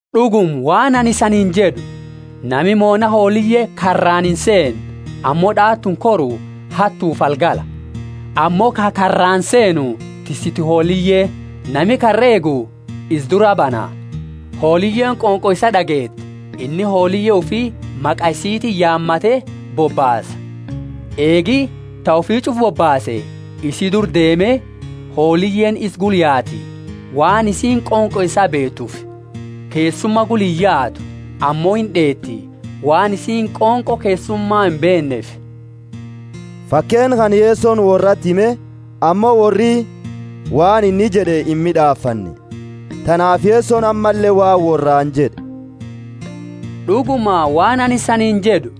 D'uguma, waan anini isaniini jed'u, Nami moona hooliye karraani inseenne, ammo d'aatuuni koru, hattufi algala. Ammo ka karraani seenu tissitu hooliyeeti. Nami karra eegu isa duraa bana; hooliyeeni qonqo isaa d'ageeti, inni hooliye ufi maqa isitiini yaamate bobbaasa. Eegi ta ufi ch'ufa bobbaase, isi dura deeme, hooliyeeni isa gula yaati, waan isiini qonqo isaa beetuufi. Keessuma gula iyaatu, ammo ind'eeti, waan isiini qonqo keessuma imbeenneefi. Fakeenna kana Yesoni worrati hime, ammo worri waan inni jed'e imid'aafanne. Tanaafi Yesoni ammalle waan worraani jed'e, D'uguma, waan anini isaniini jed'u,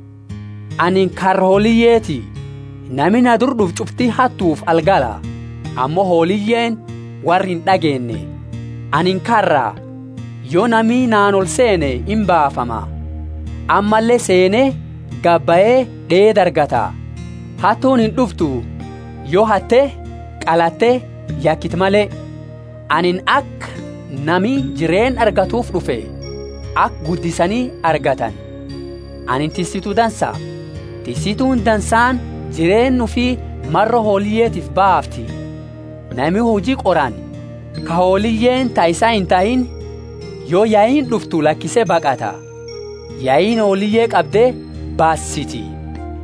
anini karra hooliyeeti. Nami na dura d'ufe ch'ufti hattufi algala; ammo hooliyeeni worra ind'ageenne. Anini karra. Yo nami naani olseene imbaafama; ammalle seene, gabahe d'eeda argata. Hattuuni ind'uftu, yo hatte, qalatte yakite male. Anini aka nami jireenna argatuufi d'ufe, aka guddisani argatani. Anini tissitu dansa. Tissituuni dansaani jireenna ufi maro hooliyetiifi baafti. Nami hujii qorani, ka hooliyeeni ta isaa intahiini, yo yaiini d'uftu lakise baqata; yaiini hooliye qabde basiti.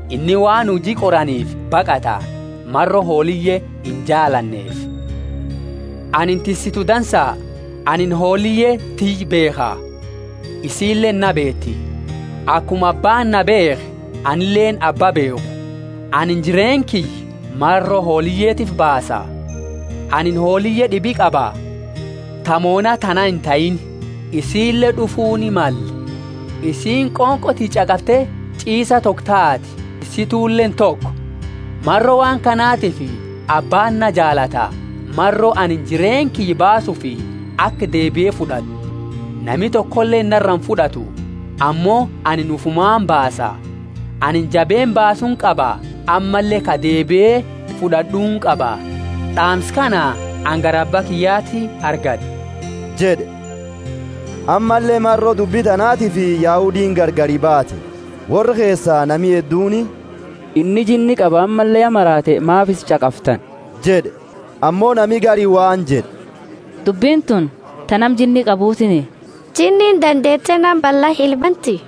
Inni waan hujii qoraniifi baqata, maro hooliye injaalanneefi. Anini tissitu dansa. Anini hooliye tiyya beekha, isiileeni na beeti, akuma Abbaani na beekhe, anileeni Abba beekhu. Anini jireenna kiyya maro hooliyetiifi baasa. Anini hooliye d'ibi qaba, ta moona tana intahiini; isiile d'ufuuni male; isiini qonqo tiyya ch'aqafte ch'iisa toko taati, tissituleeni toko. Maro waan kanatifi Abbaani na jaalata, maro anini jireenna kiyya baasuufi aka deebie fud'ad'u. Nami tokoleeni nara imfud'atu, ammo ani ufumaani baasa. Anini jabeenna baasuuni qaba, ammalle ka deebie fud'ad'uuni qaba. D'aamsa kana anini gara Abba kiyyati argad'e jed'e. Ammalle maro dubbi tanaatiifi Yahudiini gargari baate. Worra keesa nami hedduuni, Inni jinni qaba ammalle ya maraate; maafi isa ch'aqaftani? jed'e. Ammo nami gari waan jed'e, Dubbini tuni ta nama jinni qabutiiniti. Jinniini dandeete nama balla ilaa banti?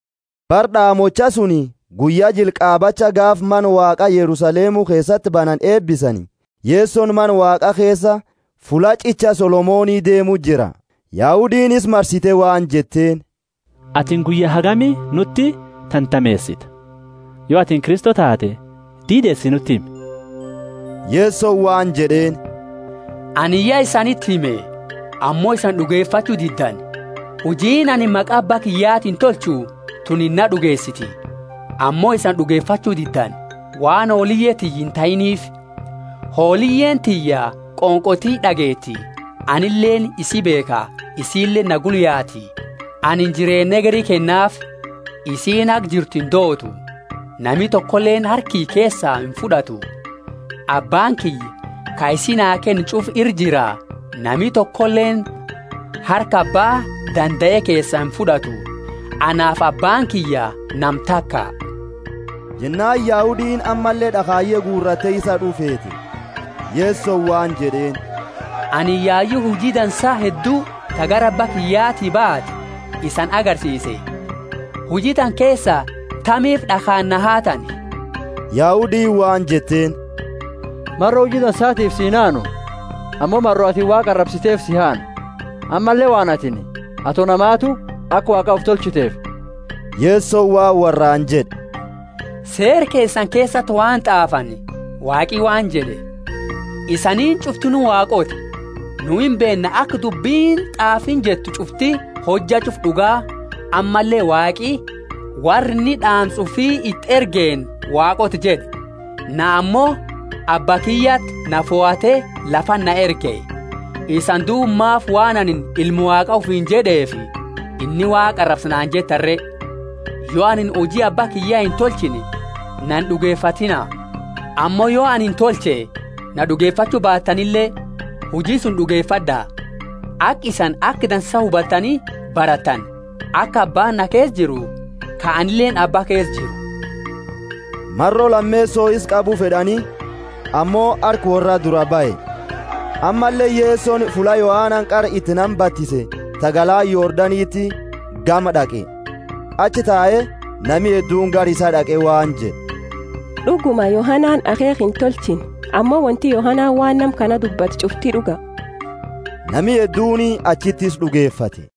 Bara d'aamochaa suni guyya jila qaabacha gaafa Mana Waaqa Yerusalemu keesati banani eebisani, Yesoni Mana Waaqa keesa fulla ch'icha Solomoni deemu jira. Yahudiini isa marsite waan jetteeni, Atini guyya hagami nuti tantameesita? Yo atini Kristo taate, diideesi nuti himi. Yesoni waan jed'eeni, Anini ya isaniti hime, ammo isani d'ugefachu diddani. Hujiini anini maqa Abba kiyyatiini tolchu tunini naa d'ugeesiti. Ammo isani d'ugefachu diddani, waan hooliye tiyya intahiiniifi. Hooliyeeni tiyya qonqo tiyya d'ageeti, anileeni isi beekha, isileeni na gula yaati. Anini jireenna hegeri kennaafi, isiini haga jirtu indootu; nami tokoleeni harka kiyya keesaa imfud'atu. Abbaani kiyya ka isi naa kenne ch'ufa ira jira. Nami tokoleeni harka Abba dandae keesaa imfud'atu. Anaafi Abbaani kiyya nama taka. Jennaani Yahudiini ammalle d'akhaye guuratte isa had'u feete. Yesoni waan jed'eeni, Anini yayu huji dansa heddu, ta gara Abba kiyyati baate isani agarsiise; huji tana keesa tamiifi d'akhaani na haatani? Yahudiini waan jetteeni, Maro huji dansaatiifi si inhaanu, ammo maro atini Waaqa arabsiteefi si haana! Ammalle waan atini, ato namaatu, aka Waaqa ufi tolchiteefi. Yesoni waan worraani jed'e, Seera keesani keesati waan t'aafani Waaqi waan jed'e, Isaniini ch'uftinu Waaqoota. Nu imbeenna aka dubbini t'aafiini jettu ch'ufti hojja ch'ufa d'uga ammalle Waaqi worra inni d'aamsa ufii iti ergeeni Waaqoota jed'e. Na ammo Abba kiyyati na fohate lafati na erge, isani duuba maafi waan anini Ilma Waaqa ufiini jed'eefi, inni Waaqa arabsa naani jettani re? Yo anini huji Abba kiyya intolchine na ind'ugefatiina. Ammo yo anini tolche, yo na d'ugefachu baatanile, huji suni d'ugefad'a; aka isani aka dansa hubatani baratani, aka abbaani na keesa jiru, ka anileeni abba keesa jiru. Maro lameeso isa qabu fed'ani, ammo harka worraa duraa bahe. Ammalle Yesoni fulla Yohanani qara iti nama batise, ta galaana Yordanitiini gama d'aqe, achi tae. Nami hedduuni gara isaa d'aqe waan jed'e, D'uguma Yohanani akheekha intolchine, ammo wonti Yohanani waan nama kana dubbate ch'ufti d'uga. Nami hedduuni achiti isa d'ugefate.